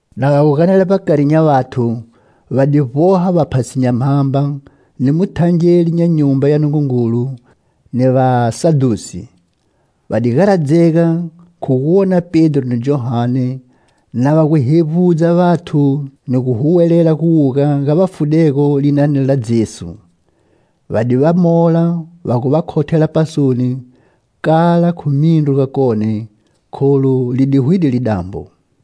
Na va gu ganela vbakari nya vathu, va di vboha vaphasi nya mhamba, ni muthangeli nya Nyumba ya Nungungulu, ni vasadhusi. Va di garadzega khu gu wona Pedro ni Johane na va gu hevbudza vathu ni gu huwelela guwuga ga vafudego linani la Jesu. Va di va mola va gu va khothela pasoni kala khu mindru gakone, kholu li di hwide lidambo.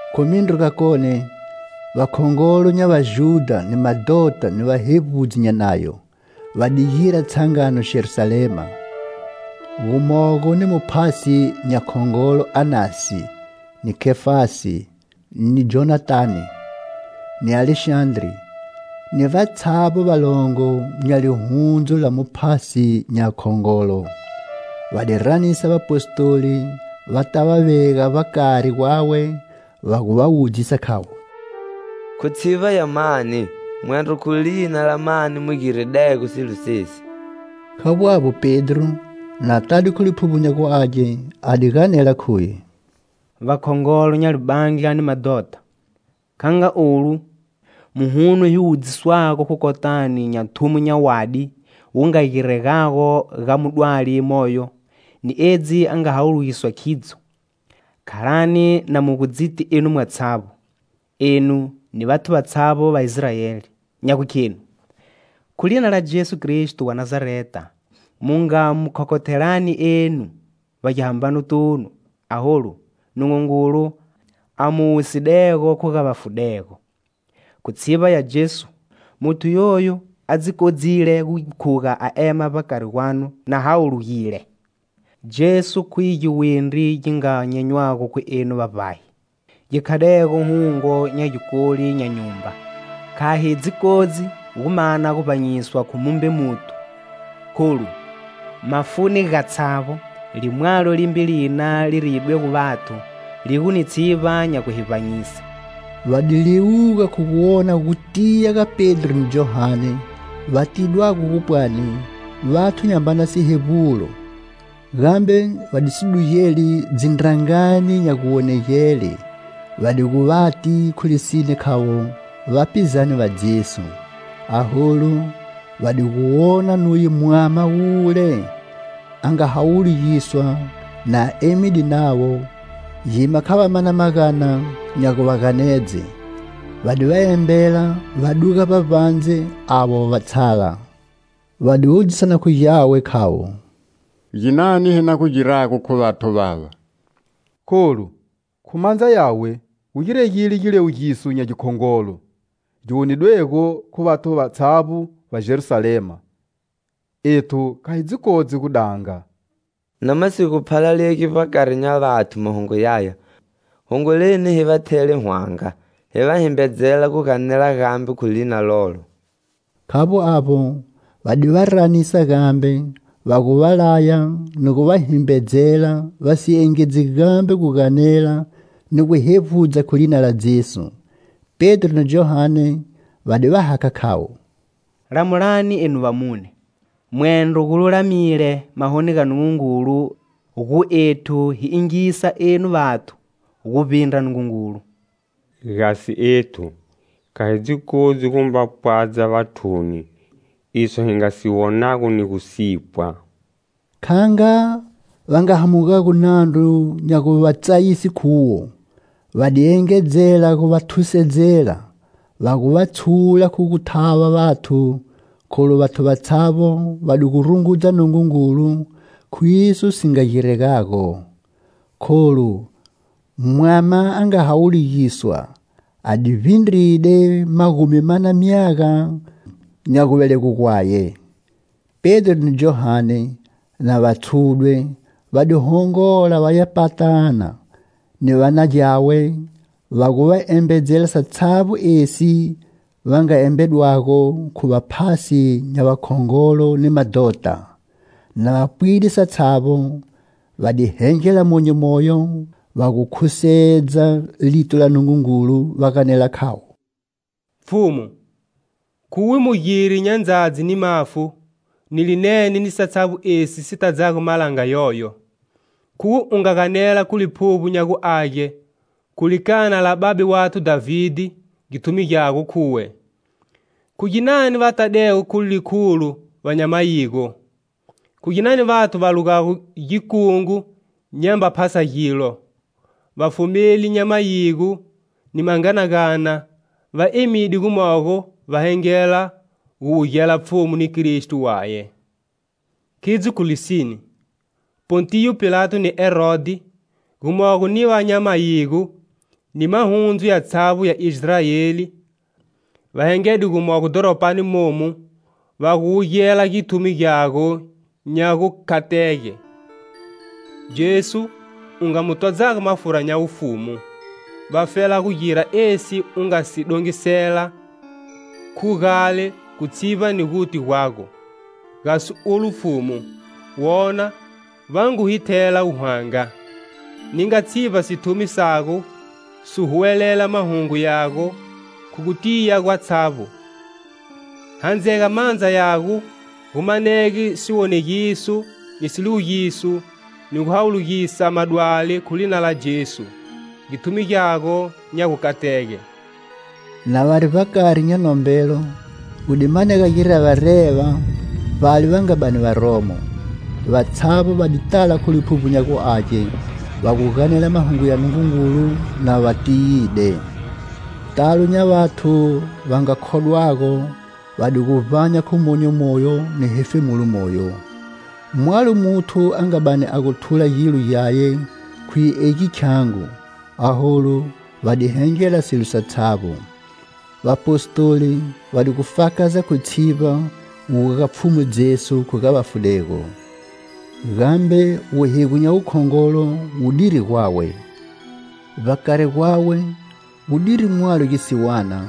Khu mindru gakone, vakhongolo nya Vajudha ni madhota ni vahevbudzi nya Nayo, va di gira tshangano Jerusalema. Gumogo ni Muphasi nya Khongolo Anasi, ni Kefasi, ni Jonathane, ni Alexandre, ni vatshavbo valongo nya lihundzu la Muphasi nya Khongolo. Va di ranisa vapostoli va ta va vega vbakari gwawe, va gu va wudzisa khavo: "Khu tshivba ya mani, mwendro khu lina la mani mu giridego silo sesi?" Khavbo avbo Pedro, na tade khu Liphuvbo nya gu Age, a di ganela khuye: "Vakhongolo nya libandla ni madhota, kha nga olu muhuno hi wudziswago khu kotani nya thumo nya wadi wu nga giregago ga mudwali moyo ni edzi a nga hawulugiswa khidzo, khalani na mu gu dziti enu mwatshavbo, enu ni vathu vatshavbo va Israeli, nya gukhenu: Khu lina la Jesu Kristo wa Nazareta mu nga mu khokhothelani enu vbagihambanotunu, aholu Nungungulu a mu wusidego khu ga vafudego. Khu tshivba ya Jesu muthu yoyu a dzi kodzile gu khuga a ema vbakari gwanu na hawulugile. Jesu khuye giwindri gi nga nyenywago khu enu vavbahi, gi khadego hungo nya gikoli nya nyumba. Kha hi dzi kodzi gu mana guvbanyiswa khu mumbe muthu, kholu, mafuni gatshavbo limwalo limbe lina li riyidwego vathu li gu ni tshivba nya gu hi vbanyise." Va di liwuga khu gu wona gutiya ga Pedro ni Johane, va tidwago gu pwani vathu nyambana sihevbulo, gambe va di si dugeli dzindrangani nya guwonegele va di gu vati khu lisine khavo vapizane va Jesu. Aholu va di gu wona nuye mwama wule a nga hawulugiswa na emide navo, gima kha va mana magana nya gu va ganedze. Va di va embela va duga vbavbandze avo va tshala va wudzisana khu gyawe, khavo: "Ginani hi na gu girago khu vathu vava? Kholu, khu mandza yawe gu giregile giliwugiso nya gikhongolo gi wonidwego khu vathu vatshavbo va Jerusalema; ethu kha hi dzi kodzi gu danga. Na ma si gu phalalegi vbakari nya vathu mahungu yaya, hongoleni hi va thele hwanga, hi va himbedzela gu ganela gambe khu lina lolo." Khavbo avbo, va di va ranisa gambe, va gu va laya ni gu va himbedzela va si engedzi gambe gu ganela ni gu hevbudza khu lina la Jesu. Pedro ni Johane va di va hakha khavo: "Lamulani enu vamune, mwendro gululamile mahoni ga Nungungulu gu ethu hi yingisa enu vathu guvbindra Nungungulu. Gasi ethu, kha hi dzi kodzi gu mba pwadza vathuni iso hi nga si wonago ni gu sipwa." Kha nga va nga hamugago nandru nya gu va tsayise khuwo, va di engedzela gu va thusedzela, va gu va tshula khu gu thava vathu, kholu vathu vatshavbo va di gu rungudza Nungungulu khu iso si nga giregago. Kholu mwama a nga hawulugiswa a di vbindride magumi mana myaga nya guvelegwe gwaye. Pedro ni Johane, na va tshudwe, va di hongola va ya patana ni va na gyawe va gu va embedzela satshavbo esi va nga embedwago khu vaphasi nya vakhongolo ni madhota. Na va pwide satshavbo, va di hengela monyo moyo va gu khusedza lito ga Nungungulu va ganela khavo: "Pfhumu, khuwe mugiri nya ndzadzi ni mafu, ni linene ni satshavbo esi si tadzago malanga yoyo. Khuwe u nga ganela khu Liphuvbo nya gu Age khu likana la babe wathu Dhavide, githumi gyago, khuye: Khu ginani va tadego khu likhulo va nya mayigo? 'Khu ginani vathu va lugago gikungu nyamba phasa gilo? Vafumeli nya mayigo ni manganagana va emide gumogo Va hengela gu wugela Pfhumu ni Kristo waye.' Khidzo khu lisine, Pontiyo Pilato ni Herodhi, gumogo ni va nya mayigo ni mahundzu yatshavbo ya Israeli va hengede gumogo dhoropani momu, va gu wugela githumi gyago nya gukatege, Jesu u nga mu todzago mafura nya wufumu, vafela gu gira esi u nga si dongisela khu gale khu tshivba ni guti gwago. Gasi olu, Pfhumu, wona, va ngu hi thela hwanga; ninga tshivba sithumi sago si huwelela mahungu yago khu gu tiya gwatshavbo; Handzega mandza yago gu manege siwonegiso ni siliwugiso ni gu hawulugisa madwali khu lina la Jesu, githumi Gyago nya gukatege." Na vari vbakari nya nombelo gu di manega girevareva vbale va nga bani va romo; vatshavbo va di tala khu Liphuvbo nya gu Age, va gu ganela mahungu ya Nungungulu na va tiyide. Talo nya vathu va nga khodwago va di gu vbanya khu monyo moyo ni hefemulo moyo. Mwalo muthu a nga bani a gu thula gilo gyaye khuye egi khyangu, aholu va di hengela silo satshavbo. Vapostoli va di gu fakaza khu tshivba guwuga ga Pfhumu Jesu khu ga vafudego. Gambe wuhigo nya wukhongolo wu diri gwawe. Vbakari gwawe gu diri mwalo gisiwana,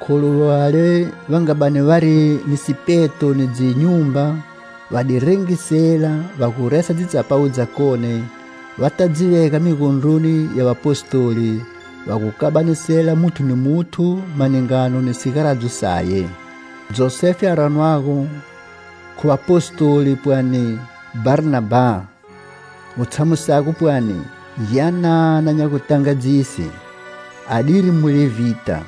kholu vale va nga bani vari ni sipeto ni dzinyumba va di rengisela va gu resa dzitsapawu dzakone, va ta dzi vega migondroni ya Vapostoli, va gu kabanisela muthu ni muthu maningano ni sigaradzo saye. Josefe a ranwago khu vapostoli pwani Bharnabha, gu tshamusago pwani "Gyanana nya gutangadzise," adiri mulevhita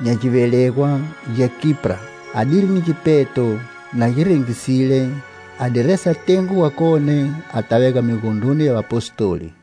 nya givelegwa gya Kipra. Adiri ni gipeto, na gi rengisile, a di resa tengo wakone a ta vega migondroni ya Vapostoli.